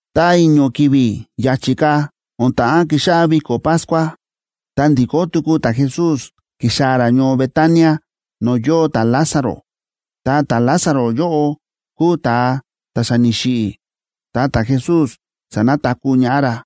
Ta i̱ño̱ ki̱vi̱ ya̱chi̱ ka̱ o̱n ta̱ꞌán kixáꞌá viko̱ Pascua, ta ndi̱kó tuku ta̱Jesús ki̱xaa̱ ra ñoo Betania no̱o̱ yóo ta̱Lázaro. Ta ta̱Lázaro yóꞌo kúu ta̱a ta̱ xa ni̱xiꞌi̱, ta ta̱Jesús sa̱nataku̱ ñaꞌá ra.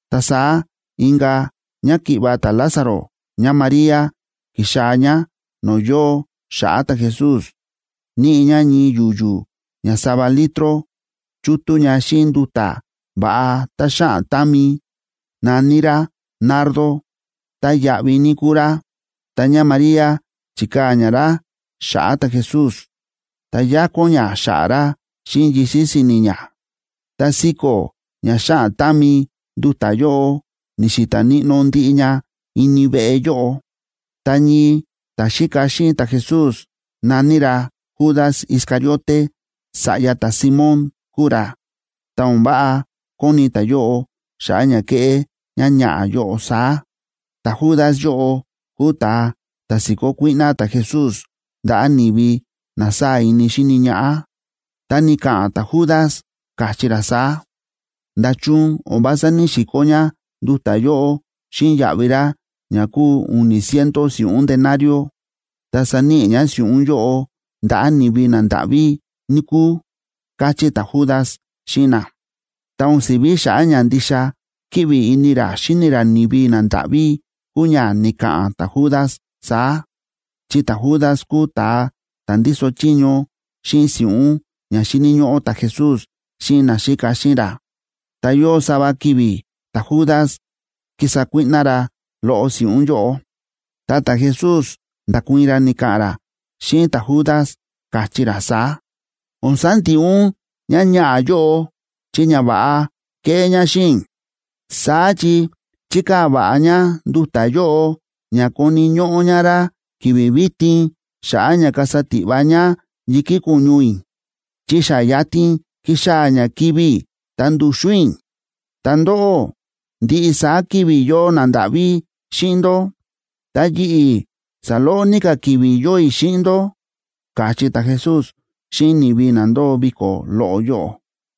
Ta saá inka̱ ñáki̱ꞌva̱ ta̱Lázaro ñáMaría, ki̱xaa̱ ñá no̱o̱ yóo xa̱ꞌa̱ ta̱Jesús. Níꞌi ñá ñii yu̱yu̱ ña sava litroa chútú ña xíꞌin nduta̱ va̱ꞌa tá xáꞌan támi, na̱ní rá nardo, tá yáꞌví ní kúu rá. Ta ñáMaría chi̱kaa̱ ñá rá xa̱ꞌa̱ ta̱Jesús, ta yákón ñá xa̱ꞌa̱ ra xíꞌin yisi̱ si̱ni̱ ñá. Ta siko̱ ña xáꞌan támi nduta̱ yóꞌo, ni̱xi̱ta̱ níꞌnó ndiꞌi ña ini veꞌe yóꞌo. Ta ñii ta̱xíka xíꞌin ta̱Jesús, na̱ní ra Judas Iscariote, sa̱ꞌya ta̱Simón kúu ra, ta o̱n váꞌa kóni ta̱yóꞌo xa̱ꞌa̱ ña ke̱ꞌé ñáñaꞌa̱ yóꞌo saá. Ta̱Judas yóꞌo kúu ta̱a ta̱ si̱kó kuíꞌná ta̱Jesús ndaꞌa̱ ni̱vi na sáa̱ ini xíni ñaꞌá. Ta ni̱ka̱ꞌa̱n ta̱Judas, káchí ra saá: ―¿Nda̱chun o̱n vása ní‑sikó ñá nduta̱ yóꞌo xíꞌin yaꞌvi rá ña kúu u̱ni̱ ciento si̱ꞌún denario,b ta saníꞌi ñá si̱ꞌún yóꞌo ndaꞌa̱ ni̱vi nandáꞌví, níkúu? ―káchí ta̱Judas xíꞌin na. Ta o̱n si̱ví xa̱ꞌa̱ ña ndixa kíꞌvi ini ra xíni ra ni̱vi nandáꞌví kúu ña ni̱ka̱ꞌa̱n ta̱Judas saá, chi ta̱Judas kúu ta̱a ta̱ ndíso chiño xíꞌin si̱ꞌún ña xíni̱ ñóꞌó ta̱Jesús xíꞌin naxíka xíꞌin ra. Ta yóo sava ki̱vi̱ ta̱Judas kísa kuíꞌná ra loꞌo si̱ꞌún yóꞌo. Ta ta̱Jesús nda̱kuii̱n ra, ni̱ka̱ꞌa̱n ra xíꞌin ta̱Judas, káchí ra saá: ―O̱n sandiꞌi ún ñáñaꞌa̱ yóꞌo chi ñava̱ꞌa ke̱ꞌé ñá xíꞌin i̱. Saá chi chi̱kaa̱ va̱ꞌa ñá nduta̱ yóꞌo ña koni̱ ñóꞌó ñá rá ki̱vi̱ vitin xa̱ꞌa̱ ña kasa tiꞌva ñá yi̱kí ko̱ñu i̱, chi xa yatin kíxaa̱ ña kivi̱ i̱ ta ndu̱xu̱n i̱. Ta ndóꞌó, ndiꞌi saá ki̱vi̱ yóo nandáꞌví xíꞌin ndó, ta yi̱ꞌi̱, saloꞌo ní ka̱ ki̱vi̱ yóo i̱ xíꞌin ndó ―káchí ta̱Jesús xíꞌin ni̱vi na ndóo viko̱ loꞌo yóꞌo.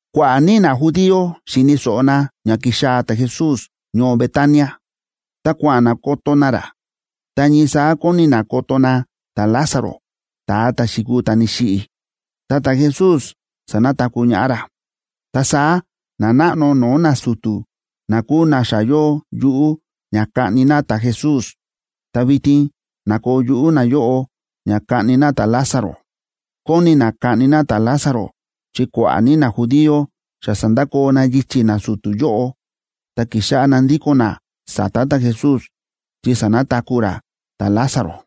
Kua̱ꞌa̱ ní najudío xi̱ni̱ so̱ꞌo na ña ki̱xaa̱ ta̱Jesús ñoo Betania, ta kua̱ꞌa̱n na koto na ra, ta ñii saá kóni na koto na ta̱Lázaro ta̱a ta̱ xi̱kuu ta̱ ni̱xiꞌi̱, ta ta̱Jesús sanataku̱ ñaꞌá ra. Ta saá nanáꞌno no̱o̱ nasu̱tu̱ na kúu na xa yóo yuꞌú ña kaꞌni na ta̱Jesús, ta vitin na̱koo yuꞌú nayóꞌo ña kaꞌni na ta̱Lázaro. Kóni na kaꞌni na ta̱Lázaro chi kua̱ꞌa̱ ní najudío xa sa̱ndakoo na yichi̱ nasu̱tu̱ yóꞌo, ta ki̱xáꞌá na ndíko̱n na sa̱ta̱ ta̱Jesús, chi sa̱nataku̱ ra ta̱Lázaro.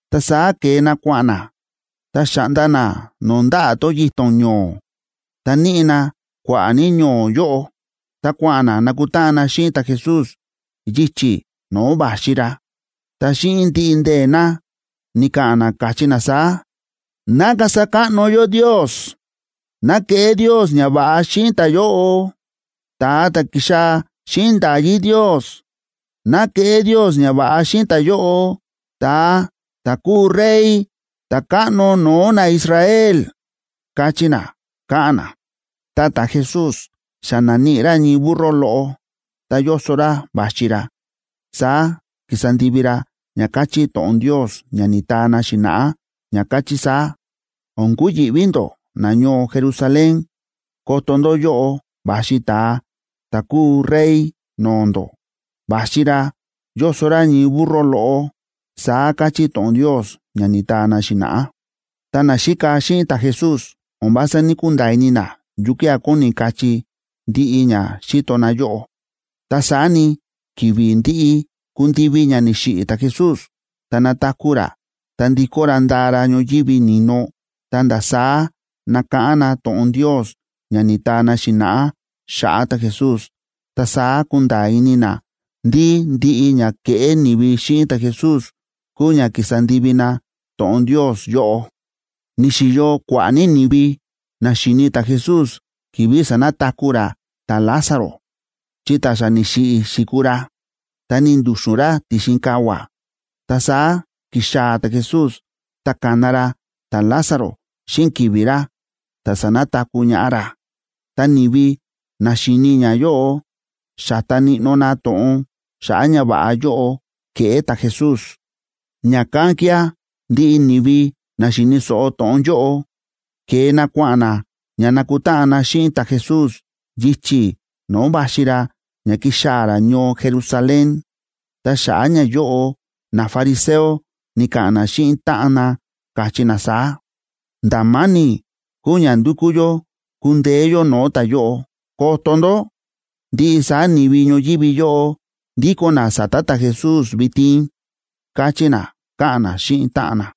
Ta saá ke̱e na kua̱ꞌa̱n na, ta xa̱ꞌnda na no̱o̱ ndaꞌa̱ tón yito̱n ño̱o̱, ta níꞌi na kua̱ꞌa̱ ní ño̱o̱ yóꞌo, ta kua̱ꞌa̱n na nakutáꞌan na xíꞌin ta̱Jesús yichi̱ no̱o̱ va̱xi ra. Ta xíꞌin ndiꞌi ndee̱ na, ni̱ka̱ꞌa̱n na, káchí na saá: ―¡Ná kasa káꞌno yó Ndios! ¡Ná keꞌé Ndios ñava̱ꞌa xíꞌin ta̱yóꞌo, ta̱a ta̱ ki̱xaa̱ xíꞌin nda̱yí Ndios! ¡Ná keꞌé Ndios ñava̱ꞌa xíꞌin ta̱yóꞌo ta̱a ta̱ kúu Rey, ta̱káꞌno no̱o̱ naIsrael! ―káchí na, káꞌa̱n na. Ta ta̱Jesús xa na̱níꞌi ra ñii burro loꞌo ta yóso ra va̱xi ra. Saá ki̱sa ndivi ra ña káchí to̱ꞌon Ndios ña ni̱taa na xi̱na̱ꞌá, ña káchí saá: O̱n kuyi̱ꞌví ndó, nañoo Jerusalén. Koto ndó, yóꞌo va̱xi ta̱a ta̱ kúu Rey no̱o̱ ndó, va̱xi ra yóso ra ñii burro loꞌo, saá káchí to̱ꞌon Ndios ña ni̱taa na xi̱na̱ꞌá. Ta naxíka xíꞌin ta̱Jesús o̱n vása ní‑kunda̱a̱ ini na yukía̱ kóni kachí ndiꞌi ña xíto na yóꞌo. Ta saá ni, ki̱vi̱ ndi̱ꞌi ku̱ndivi ña ni̱xiꞌi̱ ta̱Jesús ta na̱taku̱ ra ta ndi̱kó ra nda̱a ra ñoyívi ni̱no, ta̱nda̱ saá na̱káꞌán na to̱ꞌon Ndios ña ni̱taa na xi̱na̱ꞌá xa̱ꞌa̱ ta̱Jesús. Ta saá ku̱nda̱a̱ ini na ndí ndiꞌi ña ke̱ꞌé ni̱vi xíꞌin ta̱Jesús kúu ña ki̱sa ndivi na to̱ꞌon Ndios yóꞌo. Ni̱xi̱yo kua̱ꞌa̱ ní ni̱vi na xi̱ni ta̱Jesús ki̱vi̱ sa̱nataku̱ ra ta̱Lázaro. Chi ta̱ xa ni̱xiꞌi̱ xi̱kuu ra, ta ni̱ndu̱xu̱n ra ti̱xin kavua̱, ta saá ki̱xaa̱ ta̱Jesús, ta ka̱na ra ta̱Lázaro xíꞌin ki̱vi̱ ra, ta sa̱nataku̱ ñaꞌá ra. Ta ni̱vi na xi̱ni ñayóꞌo xa̱ta níꞌnó na to̱ꞌon xa̱ꞌa̱ ñava̱ꞌa yóꞌo ke̱ꞌé ta̱Jesús. Ña̱kán kía̱ ndiꞌi ni̱vi na xi̱ni̱ so̱ꞌo to̱ꞌon yóꞌo, ke̱e na kua̱ꞌa̱n na ña nakutáꞌan na xíꞌin ta̱Jesús yichi̱ no̱o̱ va̱xi ra ña kixaa̱ ra ñoo Jerusalén. Ta xa̱ꞌa̱ ñayóꞌo nafariseo ni̱ka̱ꞌa̱n na xíꞌin táꞌan na, káchí na saá: ―¡Nda̱ ma̱ni̱ kúu ña ndukú yó kundeé yó no̱o̱ ta̱yóꞌo! ¡Koto ndó! Ndiꞌi saá ni̱vi ñoyívi yóꞌo ndíko̱n na sa̱ta̱ ta̱Jesús vitin ―káchí na, káꞌa̱n na xíꞌin táꞌan na.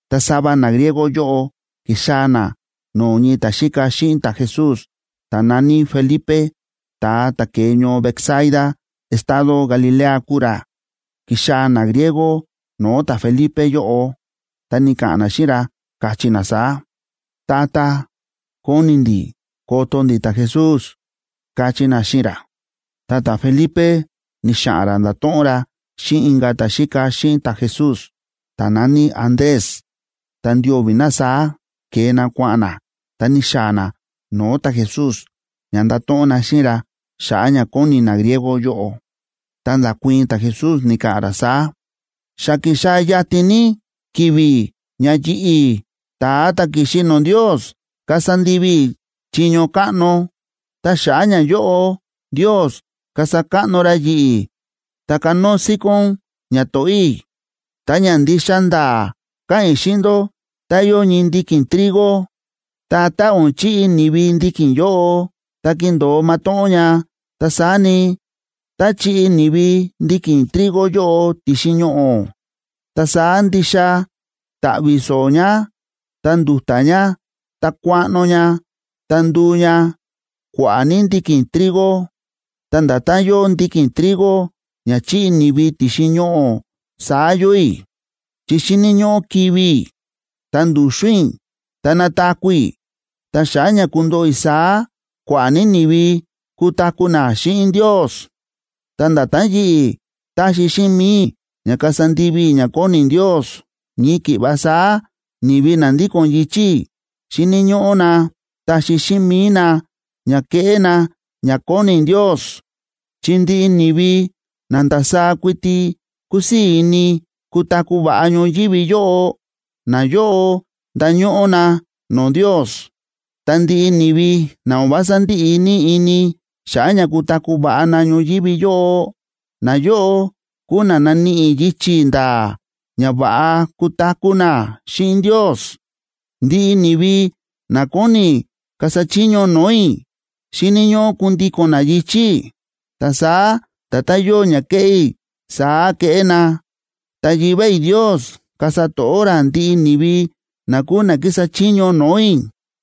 Ta sava nagriego yóꞌo ki̱xaa̱ na no̱o̱ ñii ta̱xíka xíꞌin ta̱Jesús ta̱ na̱ní Felipe, ta̱a ta̱ ke̱e ñoo Betsaida estado Galilea kúu ra. Ki̱xaa̱ nagriego no̱o̱ ta̱Felipe yóꞌo, ta ni̱ka̱ꞌa̱n na xíꞌin ra, káchí na saá: ―Tata, kóni ndi̱ koto ndi̱ ta̱Jesús ―káchí na xíꞌin ra. Ta ta̱Felipe ni̱xa̱ꞌa̱n ra nda̱to̱ꞌon ra xíꞌin inka̱ ta̱xíka xíꞌin ta̱Jesús, ta̱ na̱ní Andrés, ta ndio̱vi̱ na saá ke̱e na kua̱ꞌa̱n na, ta ni̱xaa̱ na no̱o̱ ta̱Jesús ña ndato̱ꞌon na xíꞌin ra xa̱ꞌa̱ ña kóni nagriego yóꞌo. Ta nda̱kuii̱n ta̱Jesús, ni̱ka̱ꞌa̱n ra saá: ―Xa kíxaa̱ yatin ní ki̱vi̱ ña yi̱ꞌi̱, ta̱a ta̱ ki̱xi no̱o̱ Ndios, kasa ndivi i̱ chiño káꞌno, ta xa̱ꞌa̱ ñayóꞌo Ndios kasa káꞌno ra yi̱ꞌi̱, ta kanóo síkón ñato̱ꞌó i̱. Ta ña ndixa nda̱a̱ káꞌa̱n i̱ xíꞌin ndó tá yóo ñii ndiki̱n trigo, ta tá o̱n chiꞌi ni̱vi ndiki̱n yóꞌo, ta kindo̱o matóꞌón ña. Ta saá ni, tá chiꞌi ni̱vi ndiki̱n trigo yóꞌo ti̱xin ñoꞌo̱, ta saá ndixa ta̱ꞌvi̱ so̱o̱ ña, ta ndu̱ta̱ ña ta kuaꞌno ña, ta nduu ña kua̱ꞌa̱ ní ndiki̱n trigo. Ta nda̱tán yóo ndiki̱n trigo ña chiꞌi ni̱vi ti̱xin ñoꞌo̱ saá yóo i̱ chi xíni̱ ñóꞌó kivi̱ i̱, ta ndu̱xu̱n i̱, ta nataku̱ i̱. Ta xa̱ꞌa̱ ña kundoꞌo i̱ saá, kua̱ꞌa̱ ní ni̱vi kutaku̱ na xíꞌin Ndios. Ta nda̱tán yi̱ꞌi̱ táxi xíꞌin mi̱i i̱ ña kasa ndivi i̱ ña kóni Ndios, ñii ki̱ꞌva saá ni̱vi na ndíko̱n yichi̱ i̱, xíni̱ ñóꞌó na taxi xíꞌin mi̱i na ña keꞌé na ña kóni Ndios. Chi ndiꞌi ni̱vi na ndasaá kuiti kúsii̱ ini kutaku̱ va̱ꞌa ñoyívi yóꞌo, nayóꞌo ndañóꞌó na no̱o̱ Ndios. Ta ndiꞌi ni̱vi na o̱n vása ndíꞌi ní ini xa̱ꞌa̱ ña kutaku̱ va̱ꞌa na ñoyívi yóꞌo, nayóꞌo kúu na naníꞌi yichi̱ nda̱a̱ ña va̱ꞌa kutaku̱ na xíꞌin Ndios. Ndiꞌi ni̱vi na kóni kasa chiño no̱o̱ i̱, xíni̱ ñóꞌó kundíko̱n na yichi̱ i̱, ta saá nda̱tán yóo ña kéꞌé i̱, saá keꞌé na. Ta Yivá i̱ Ndios kasa to̱ꞌó ra ndiꞌi ni̱vi na kúu na kísa chiño no̱o̱ i̱.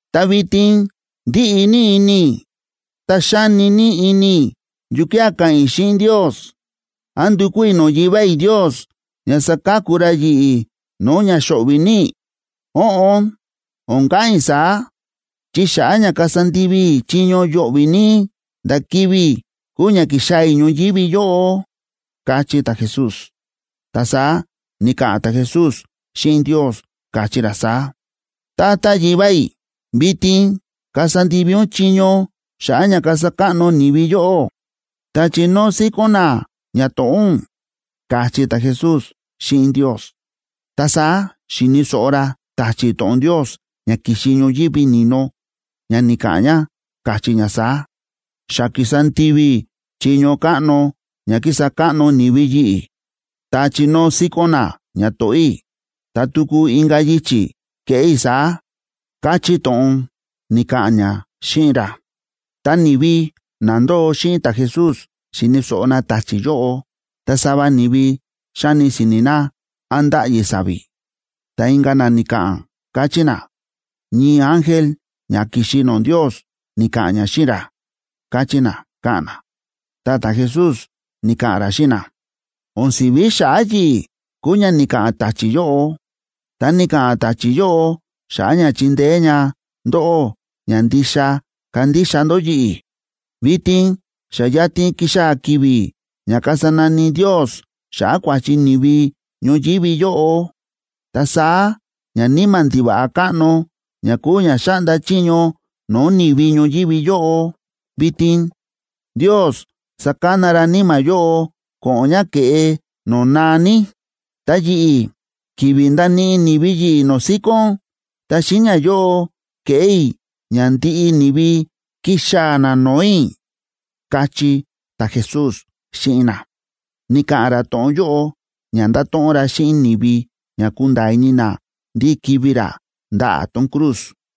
’Ta vitin ndíꞌi ní ini i̱, ta xáni ní ini i̱ yukía̱ ka̱ꞌa̱n i̱ xíꞌin Ndios. ¿Án ndukú i̱ no̱o̱ Yivá i̱ Ndios ña saka̱ku ra yi̱ꞌi̱ no̱o̱ ña xo̱ꞌvi̱ ní i̱? Óꞌon, o̱n ka̱ꞌa̱n i̱ saá, chi xa̱ꞌa̱ ña kasa ndivi i̱ chiño yo̱ꞌvi̱ ní, nda̱ kivi̱ i̱ kúu ña ki̱xaa̱ i̱ ñoyívi yóꞌo ―káchí ta̱Jesús. Ta saá ni̱ka̱ꞌa̱n ta̱Jesús xíꞌin Ndios, káchí ra saá: ―Tata Yivá i̱, vitin kasa ndivi ún chiño xa̱ꞌa̱ ña kasa káꞌno ni̱vi yóꞌó ta chinóo síkón na ñato̱ꞌó ún ―káchí ta̱Jesús xíꞌin Ndios. Ta saá xi̱ni̱ so̱ꞌo ra ta̱chi̱ to̱ꞌon Ndios ña ki̱xi ñoyívi ni̱no ña ni̱ka̱ꞌa̱n ña, káchí ña saá: ―Xa ki̱sa ndivi i̱ chiño káꞌno ña ki̱sa káꞌno ni̱vi yi̱ꞌi̱, ta chi̱nóo síkón na ñato̱ꞌó i̱, ta tuku inka̱ yichi̱ keꞌé i̱ saá ―káchí to̱ꞌon ni̱ka̱ꞌa̱n ña xíꞌin ra. Ta ni̱vi na ndóo xíꞌin ta̱Jesús xi̱ni̱ so̱ꞌo na ta̱chi̱ yóꞌo, ta sava ni̱vi xa̱ni si̱ni̱ na án ndáꞌyi sa̱vi̱. Ta inka̱ na ni̱ka̱ꞌa̱n, káchí na: ―Ñii ángel ña ki̱xi no̱o̱ Ndios ni̱ka̱ꞌa̱n ña xíꞌin ra ―káchí na, káꞌa̱n na. Ta ta̱Jesús ni̱ka̱ꞌa̱n ra xíꞌin na: ―O̱n si̱ví xa̱ꞌa̱ yi̱ꞌi̱ kúu ña ni̱ka̱ꞌa̱n ta̱chi̱ yóꞌo, ta ni̱ka̱ꞌa̱n ta̱chi̱ yóꞌo xa̱ꞌa̱ ña chindeé ña ndóꞌó ña ndixa kandixa ndó yi̱ꞌi̱. Vitin xa yatin kíxaa̱ ki̱vi̱ ña kasa nani Ndios xa̱ꞌa̱ kua̱chi ni̱vi ñoyívi yóꞌo. Ta saá ñaníma̱ ndiva̱ꞌa káꞌno, ña kúu ña xáꞌnda chiño no̱o̱ ni̱vi ñoyívi yóꞌo vitin, Ndios sakana ra níma̱ yóꞌo ko̱ꞌo̱n ña ke̱ꞌe no̱o̱ naa ní. Ta yi̱ꞌi̱, ki̱vi̱ ndaníꞌi ni̱vi yi̱ꞌi̱ no̱o̱ síkón, ta xíꞌin ñayóꞌo keꞌé i̱ ña ndiꞌi ni̱vi kixaa̱ na no̱o̱ i̱ ―káchí ta̱Jesús xíꞌin na. Ni̱ka̱ꞌa̱n ra to̱ꞌon yóꞌo ña ndato̱ꞌon ra xíꞌin ni̱vi ña kunda̱a̱ ini na ndí kivi̱ ra ndaꞌa̱ tón cruz.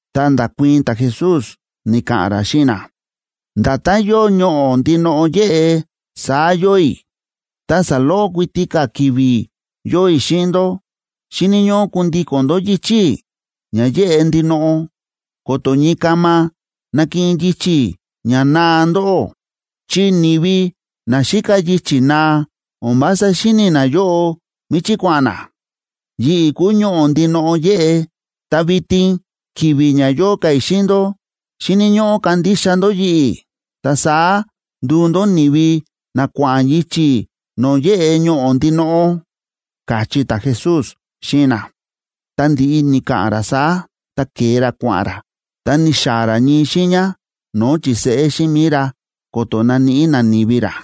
Ta nda̱kuii̱n ta̱Jesús, ni̱ka̱ꞌa̱n ra xíꞌin na: ―Nda̱tán yóo ñoꞌo̱ ndinoꞌo yéꞌe, saá yóo i̱, ta saloꞌo kuiti ka̱ ki̱vi̱ yóo i̱ xíꞌin ndó. Xíni̱ ñóꞌó kundíko̱n ndó yichi̱ i̱ ña yéꞌe ndinoꞌo, ko̱to̱ ñii kama nakiꞌin yichi̱ ña naa ndóꞌó. Chi ni̱vi na xíka yichi̱ naa o̱n vása xíni̱ nayóꞌo míchí kua̱ꞌa̱n na. Yi̱ꞌi̱ kúu Ñoꞌo̱ ndinoꞌo yéꞌe, ta vitin ki̱vi̱ ña yóo ka̱ i̱ xíꞌin ndó, xíni̱ ñóꞌó kandixa ndó yi̱ꞌi̱. Ta saá nduu ndó ni̱vi na kua̱ꞌa̱n yichi̱ no̱o̱ yéꞌe Ñoꞌo̱ ndinoꞌo ―káchí ta̱Jesús xíꞌin na. Ta ndi̱ꞌi ni̱ka̱ꞌa̱n ra saá, ta ke̱e ra kua̱ꞌa̱n ra, ta ni̱xaa̱ ra ñii xiiña no̱o̱ chi̱seꞌé xíꞌin mi̱i ra ko̱to̱ naníꞌi nani̱vi ra.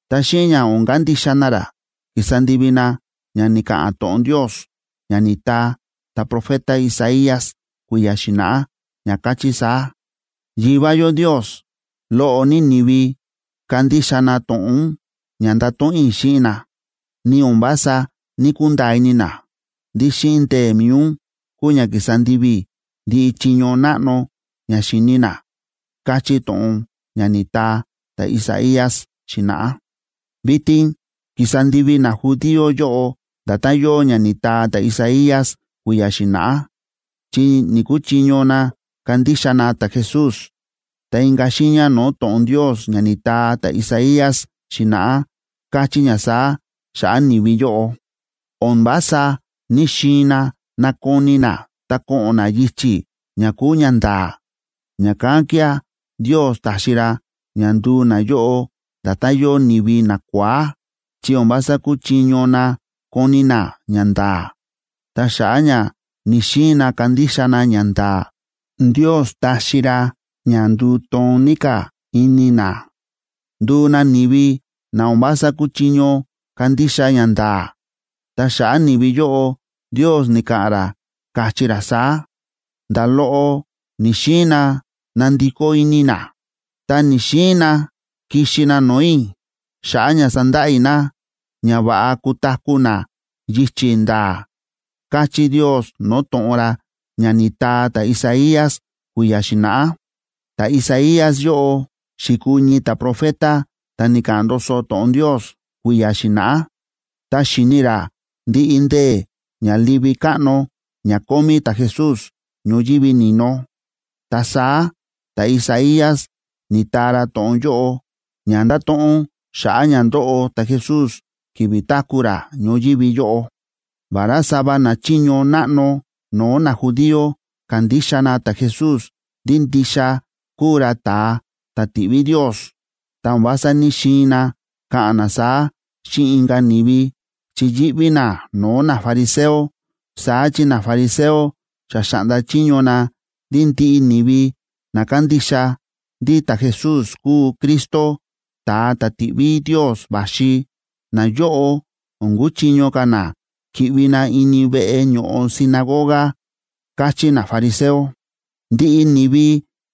Ta xíꞌin ña o̱n kandixa na ra, ki̱sa ndivi na ña ni̱ka̱ꞌa̱n to̱ꞌon Ndios ña ni̱taa ta̱profeta Isaías kui̱ya̱ xi̱na̱ꞌá, ña káchí saá: Yivá yó Ndios, loꞌo ní ni̱vi ka̱ndixa na to̱ꞌon ún ña nda̱to̱ꞌon i̱ xíꞌin na. Ni o̱n vása ní‑kunda̱a̱ ini na ndí xíꞌin ndee̱ mi̱i ún kúu ña ki̱sa ndivi i̱ ndiꞌi chiño náꞌno ña xi̱ni na, káchí to̱ꞌon ña ni̱taa ta̱Isaías xi̱na̱ꞌá. Vitin kísa ndivi najudío yóꞌo nda̱tán yóo ña ni̱taa ta̱Isaías kui̱ya̱ xi̱na̱ꞌá, chi ni̱‑kuchiño na kandixa na ta̱Jesús. Ta inka̱ xiiña no̱o̱ to̱ꞌon Ndios ña ni̱taa ta̱Isaías xi̱na̱ꞌá, káchí ña saá xa̱ꞌa̱ ni̱vi yóꞌo: O̱n vása ní‑xiin na nakoni na ta ko̱ꞌo̱n na yichi̱ ña kúu ñanda̱a̱, ña̱kán kía̱ Ndios ta̱xi ra ña nduu nayóꞌo nda̱tán yóo ni̱vi nakua̱á, chi o̱n vása kúchiño na koni na ñanda̱a̱. Ta xa̱ꞌa̱ ña ni̱‑xiin na kandixa na ñanda̱a̱, Ndios ta̱xi ra ña nduu toon ní ka̱ ini na, nduu na ni̱vi na o̱n vása kúchiño kandixa ñanda̱a̱. Ta xa̱ꞌa̱ ni̱vi yóꞌo, Ndios ni̱ka̱ꞌa̱n ra, káchí ra saá: “Nda̱ loꞌo ni̱‑xiin na nandikó ini na, ta ni̱‑xiin na kixi na no̱o̱ i̱ xa̱ꞌa̱ ña sandaꞌa i̱ na ña va̱ꞌa kutaku̱ na yichi̱ nda̱a̱”, káchí Ndios no̱o̱ to̱ꞌon ra ña ni̱taa ta̱Isaías kui̱ya̱ xi̱na̱ꞌá. Ta̱Isaías yóꞌo xi̱kuu ñii ta̱profeta ta̱ ni̱ka̱ꞌa̱n ndoso to̱ꞌon Ndios kui̱ya̱ xi̱na̱ꞌá, ta xi̱ni ra ndiꞌi ndee̱ ña livi káꞌno ña kómí ta̱Jesús ñoyívi ni̱no. Ta saá ta̱Isaías ni̱taa ra to̱ꞌon yóꞌo, ña ndáto̱ꞌon xa̱ꞌa̱ ña ndóꞌo ta̱Jesús ki̱vi̱ táku̱ ra ñoyívi yóꞌo. Vará sava nachiño náꞌno no̱o̱ najudío kándixa na ta̱Jesús ndí ndixa kúu ra ta̱a ta̱ ti̱ꞌví Ndios, ta o̱n vása ní‑xiin na ka̱ꞌa̱n na saá xíꞌin inka̱ ni̱vi chi yíꞌví na no̱o̱ nafariseo. Saá chi nafariseo xa xa̱ꞌnda chiño na ndí ndiꞌi ni̱vi na kándixa ndí ta̱Jesús kúu Cristo, ta̱a ta̱ ti̱ꞌví Ndios va̱xi, nayóꞌo o̱n kuchiño ka̱ na ki̱ꞌvi na ini veꞌe ño̱ꞌo sinagoga, káchí nafariseo. Ndiꞌi ni̱vi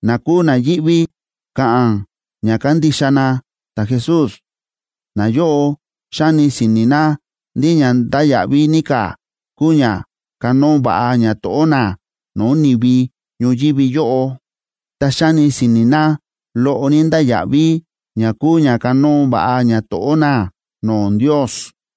na kúu na yíꞌví ka̱ꞌa̱n ña kándixa na ta̱Jesús, nayóꞌo xáni si̱ni̱ na ndí ña ndáya̱ꞌví ní ka̱ kúu ña kanóo va̱ꞌa ñato̱ꞌó na no̱o̱ ni̱vi ñoyívi yóꞌo, ta xáni si̱ni̱ na loꞌo ní ndáya̱ꞌví ña kúu ña kanóo va̱ꞌa ñato̱ꞌó na no̱o̱ Ndios.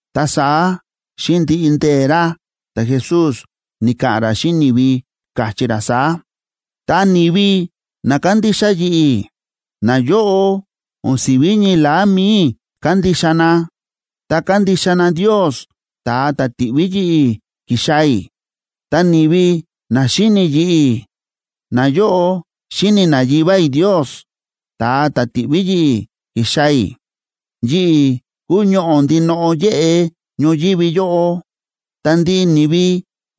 Ta saá xíꞌin ndiꞌi ndee̱ ra, ta̱Jesús ni̱ka̱ꞌa̱n ra xíꞌin ni̱vi, káchí ra saá: ―Ta ni̱vi na kándixa yi̱ꞌi̱, nayóꞌo o̱n si̱ví ñii la̱á mi̱i i̱ kándixa na, ta kándixa na Ndios, ta̱a ta̱ ti̱ꞌví yi̱ꞌi̱ ki̱xaa̱ i̱. Ta ni̱vi na xíni yi̱ꞌi̱, nayóꞌo xíni na Yivá i̱ Ndios, ta̱a ta̱ ti̱ꞌví yi̱ꞌi̱ ki̱xaa̱ i̱. Yi̱ꞌi̱ kúu Ñoꞌo̱ ndinoꞌo yéꞌe ñoyívi yóꞌo. Ta ndiꞌi ni̱vi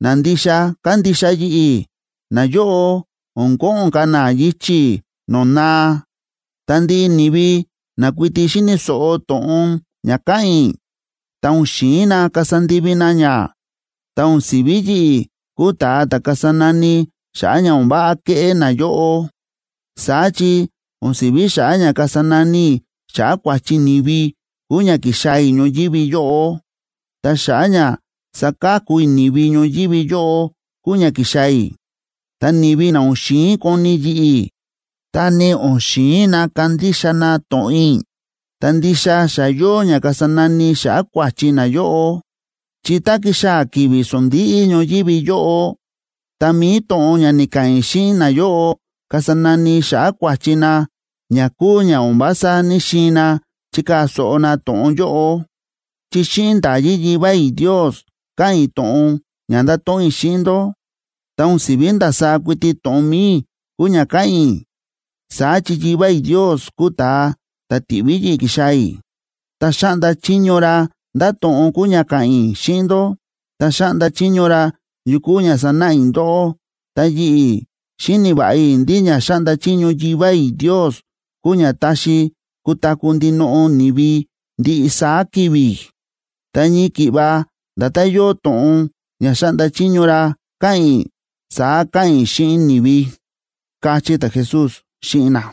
na ndixa kándixa yi̱ꞌi̱, nayóꞌo o̱n ko̱ꞌo̱n ka̱ na yichi̱ no̱o̱ naa. Ta ndiꞌi ni̱vi na kuiti xíni̱ so̱ꞌo to̱ꞌon ña káꞌa̱n i̱, ta o̱n xi̱in na kasa ndivi na ña, ta o̱n si̱ví yi̱ꞌi̱ kúu ta̱a ta̱ kasa nani xa̱ꞌa̱ ña o̱n váꞌa kéꞌé nayóꞌo. Saá chi o̱n si̱ví xa̱ꞌa̱ ña kasa nani i̱ xa̱ꞌa̱ kua̱chi ni̱vi kúu ña ki̱xaa̱ i̱ ñoyívi yóꞌo, ta xa̱ꞌa̱ ña saka̱ku i̱ ni̱vi ñoyívi yóꞌo kúu ña ki̱xaa̱ i̱. Ta ni̱vi na o̱n xi̱in koni yi̱ꞌi̱, ta ni o̱n xi̱in na kandixa na to̱ꞌon i̱, ta ndixa xa yóo ña kasa nani xa̱ꞌa̱ kua̱chi nayóꞌo. Chi tá ki̱xaa̱ ki̱vi̱ sondíꞌí ñoyívi yóꞌo, ta mi̱i to̱ꞌon ña ni̱ka̱ꞌa̱n i̱ xíꞌin nayóꞌo kasa nani xa̱ꞌa̱ kua̱chi na ña kúu ña o̱n vása ní‑xiin na chikaa̱ so̱ꞌo na to̱ꞌon yóꞌo. Chi xíꞌin nda̱yí Yivá i̱ Ndios káꞌa̱n i̱ to̱ꞌon ña ndáto̱ꞌon i̱ xíꞌin ndó. Ta o̱n si̱ví ndasaá kuiti to̱ꞌon mi̱i i̱ kúu ña káꞌa̱n i̱. Saá chi Yivá i̱ Ndios kúu ta̱a ta̱ ti̱ꞌví yi̱ꞌi̱ ki̱xaa̱ i̱, ta xa̱ꞌnda chiño ra ndá to̱ꞌon kúu ña ka̱ꞌa̱n i̱ xíꞌin ndó, ta xa̱ꞌnda chiño ra yu kúu ña sanáꞌa i̱ ndóꞌó. Ta yi̱ꞌi̱, xíni̱ va̱ꞌa i̱ ndí ña xáꞌnda chiño Yivá i̱ Ndios kúu ña táxi kutaku̱ ndinoꞌo ni̱vi ndiꞌi saá ki̱vi̱. Ta ñii ki̱ꞌva nda̱tán yóo to̱ꞌon ña xa̱ꞌnda chiño ra ka̱ꞌa̱n i̱, saá káꞌa̱n i̱ xíꞌin ni̱vi ―káchí ta̱Jesús xíꞌin na.